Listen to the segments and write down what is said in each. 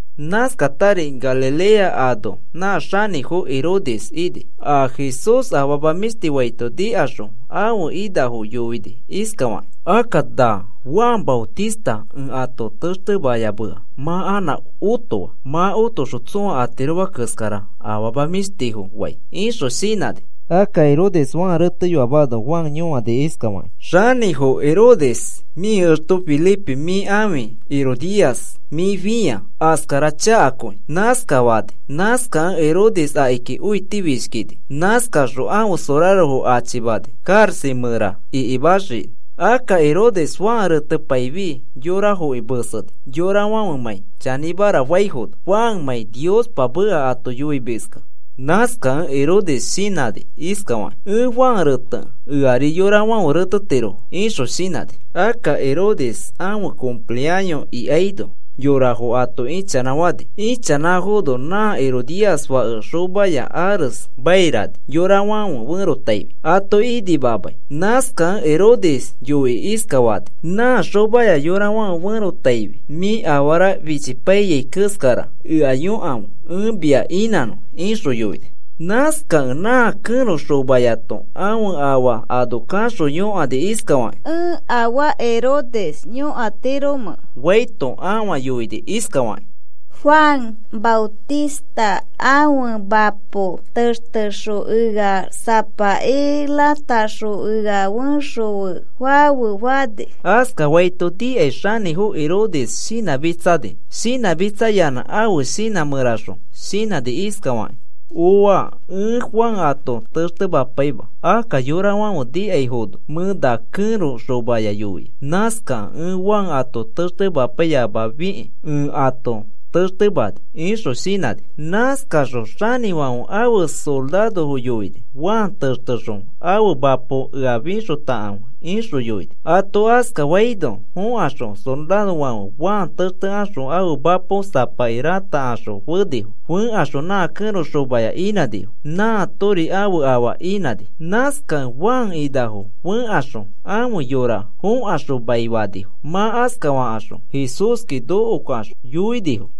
Nãskatari Galilea anoa nã xanĩfo Herodes ini. A Jesús afama mĩshti faito nikaxõ ãfe inafo yoini iskafakĩ: “Akka nã Juan Maotista ẽ ato textemayamea mã anã otoa. Mã otoxõ tsõa atiroma keskara afama mĩshtifo fai,” ixõ shinãni. Akka Herodes Juan reteyoamano Juan yõani iskafakĩ: “Xanĩfo Herodes, mĩ exto Felipe mĩ ãfe ãfi Herodías mĩ fĩa. Askara chakakõi,” nãskafani. Nãskakẽ Herodes akiki õitifishkini. Nãskaxõ ãfe sorarofo achimani karaxa mẽra ikimaxii. Akka Herodes Juan retepaifi yorafoki meseni yorafãfemãi chanĩmara faifono Juanmãi Niospa meka ato yoimiskẽ. Nãskakẽ Herodes shinãni iskafakĩ: “Ẽ Juan retekẽ eari yorafãfe retetirofo,” ixõ shinãni. Akka Herodes ãfe cumpleaño ikaino, yorafo ato ichanãfani. Ichanãfono nã Herodías fake xomaya ares mairani yorafãfe ferotaifi ato inimamai. Nãskakẽ Herodes yoikĩ iskafani nã xomaya yorafãfe ferotaifi, “Mĩ afara fichipaiyai keskara ea yõkafe ẽ mia inãnõ,” ixõ yoini. Nãskakẽ nã kẽro xomayato ãfe afa ano kaxõ yõkani iskafakĩ: “¿Ẽ afaa Herodes yõkatiromẽ?” faito ãfa yoini iskafakĩ: “Juan Maotista ãfe mapo textexõ ea sapaki rataxõ ea fexõfe fafe,” fani. Askafaito nikai xanĩfo Herodes shinãmitsani. Shinãmitsayanã ãfe shinã mẽraxõ shinãni iskafakĩ: “¡Ooa! Ẽ Juan ato textemapaima. Akka yorafãfe nikaifono mẽ na kẽro xomaya yoia. Nãskakẽ ẽ Juan ato textemapaiyamafikĩ ẽ ato textemani,” ixõ shinãni. Nãskaxõ xanĩfãfe ãfe sorarofo yoini: “Juan textexõ ãfe mapo ea fixotakãfe,” ixõ yoini. Ato askafaino fõkaxõ sorarofãfe Juan textekaxõ ãfe mapo sapaki ratakaxõ fenifo. Fẽkaxõ nã kẽro xomaya inãnifo. Nãatori ãfe afa inãni. Nãskakẽ Juan inafo fẽkaxõ ãfe yora fõkaxõ maifanifo. Mã askafakaxõ Jesúski nokokaxõ yoinifo.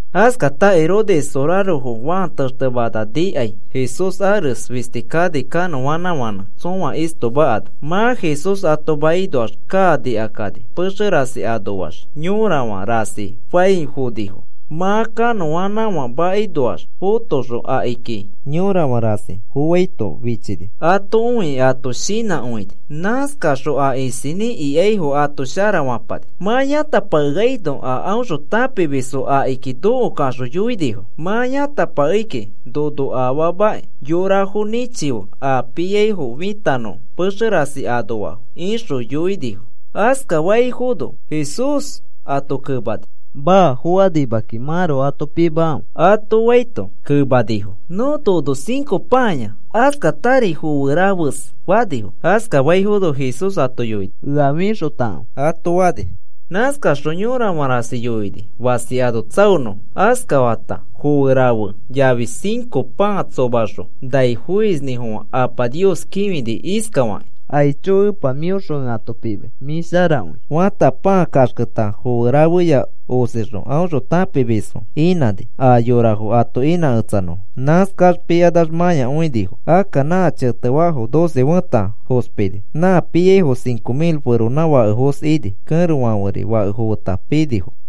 Askata Herodes sorarofo Juan textemana nikai Jesús ares fisti kani kanõanãfãnẽ tsõa istoma ano. Mã Jesús ato makinoax kaa nikakani pexe rasi anoax yorafã rasi fãi fonifo. Mã kanõanãfã makinoax fotoxõ akiki yorafã rasi foaito fichini. Ato õikĩ ato shinãkõini. Nãskaxõ a isinĩ ikaifo ato sharafapani. Mã yãtapakeaino aõxõ tãpimisfo akiki nokokaxõ yoinifo: “Mã yãtapakei kiki nono afaamakĩ yorafo nĩchife a piaifo fitanõfo pexe rasi anoafo,” ixõ yoinifo. Askafaifono Jesús ato kemani: “Maa. Fokanima kiki. Mãroko ato pimakãfe,” ato faito, kemanifo: “Nõ nono cinco pãaya, askatari foe rafes,” fanifo. Askafaifono Jesús ato yoini: “Ea fixotakãfe,” ato fani. Nãskaxõ yorafã rasi yoini fasi ano tsaonõfo. Askata foe rafe yafi cinco pãa tsomaxõ nai foisinĩfofã Apa Nios kĩfini iskafakĩ: “Aicho, Epa, mĩõxõ ẽ ato pimai. Mĩ sharakõi,” fata, pãa kaxketa foe rafeya osixõ aõxõ tãpimisfo inãni a yorafo ato inãketsanõfo. Nãskax pikanax mãyakõinifo. Akka nã chetefaafo doce fẽta fospini. Nã piaifo cinco mil feronãfakefos ini. Kẽrofãferi fakefo feta pinifo.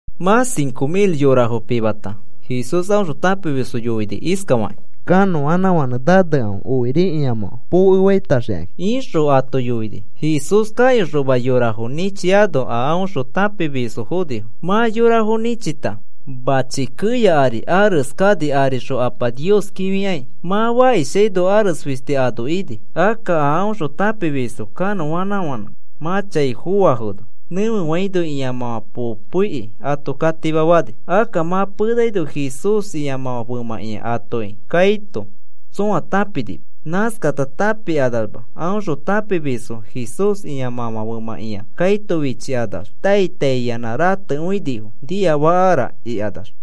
Mã cinco mil yorafo pimata Jesús aõxõ tãpimisfo yoini iskafakĩ: “Kanõanãfãnẽ nanekãfe, okiri ĩamãfã pokefaitaxikãkĩ,” ixõ ato yoini. Jesús kayoxoma yorafo nĩchiaino aõxõ tãpimisfo fonifo. Mã yorafo nĩchita, mãchi keya ari arese kani arixõ Apa Nios kĩfikai. Mã fakishaino, ares fisti ano ini. Akka a aõxõ tãpimisfo kanõanãfãnẽ mã chai foafono, nẽfefaino ĩamãfã poikĩ ato katimafani. Akka mã penaino Jesús ĩa femãkĩa atoki kaito tsõa tãpinima. Nãskata tãpikanamax aõxõ tãpimisfo Jesús ĩamãfã femãkĩa kaito fichikanax tai tai iyanã ratekõinifo, niafakara ikanax.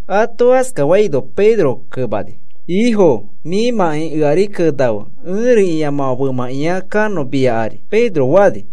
Ato askafaino Pedro kemani: “Ifo, mĩmãkĩ eari kenafe ẽri ĩamãfã femãkĩa kanõ mia ari,” Pedro fani.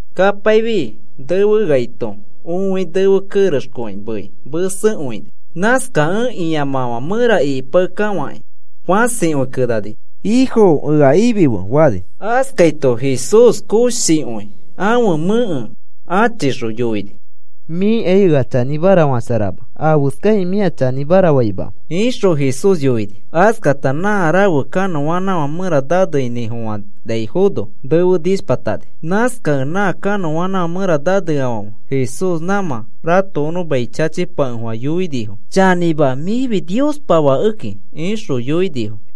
Kapaifi nefeaito õi nefe kerexkõi mei mesekõini. Nãskakẽ ĩamãfã mẽra ikipakekafakĩ fãsikõi kenani: “¡Ifo, ea ifife!” fani. Askaito Jesús koshikõi ãfe mẽke achixõ yoini: “Mĩkai ea chanĩmara fasharama. ¿Afeskakĩ mĩa chanĩmara faimamẽ?” ixõ Jesús yoini. Askata nã rafe kanõanãfã mẽra naneinĩfofanaifono nefe nishpatani. Nãskakẽ nã kanõanãfã mẽra naneafãfe Jesús nãmã ratokonõ mai chachipakefofã yoinifo: “Chanĩma, mĩfi Niospa Fakeki,” ixõ yoinifo.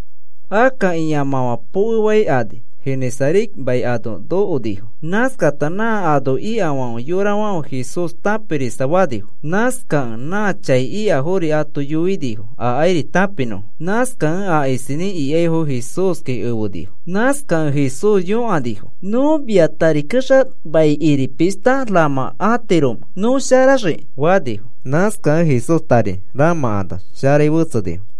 Akka ĩamãfã pokefaikani Genesaret mai ano nokonifo. Nãskata nã ano ikafãfe yorafãfe Jesús tãpirisafanifo. Nãskakẽ nã chai ikafori ato yoinifo akairi tãpinõfo. Nãskakẽ a isinĩ ikaifo Jesúski efenifo. Nãskakẽ Jesús yõkanifo: “¿Nõ mia tari kexa maikiri pishta ramãkatiromẽ nõ sharaxiki?” fanifo. Nãskakẽ Jesús tari ramãkanax sharai fetsenifo.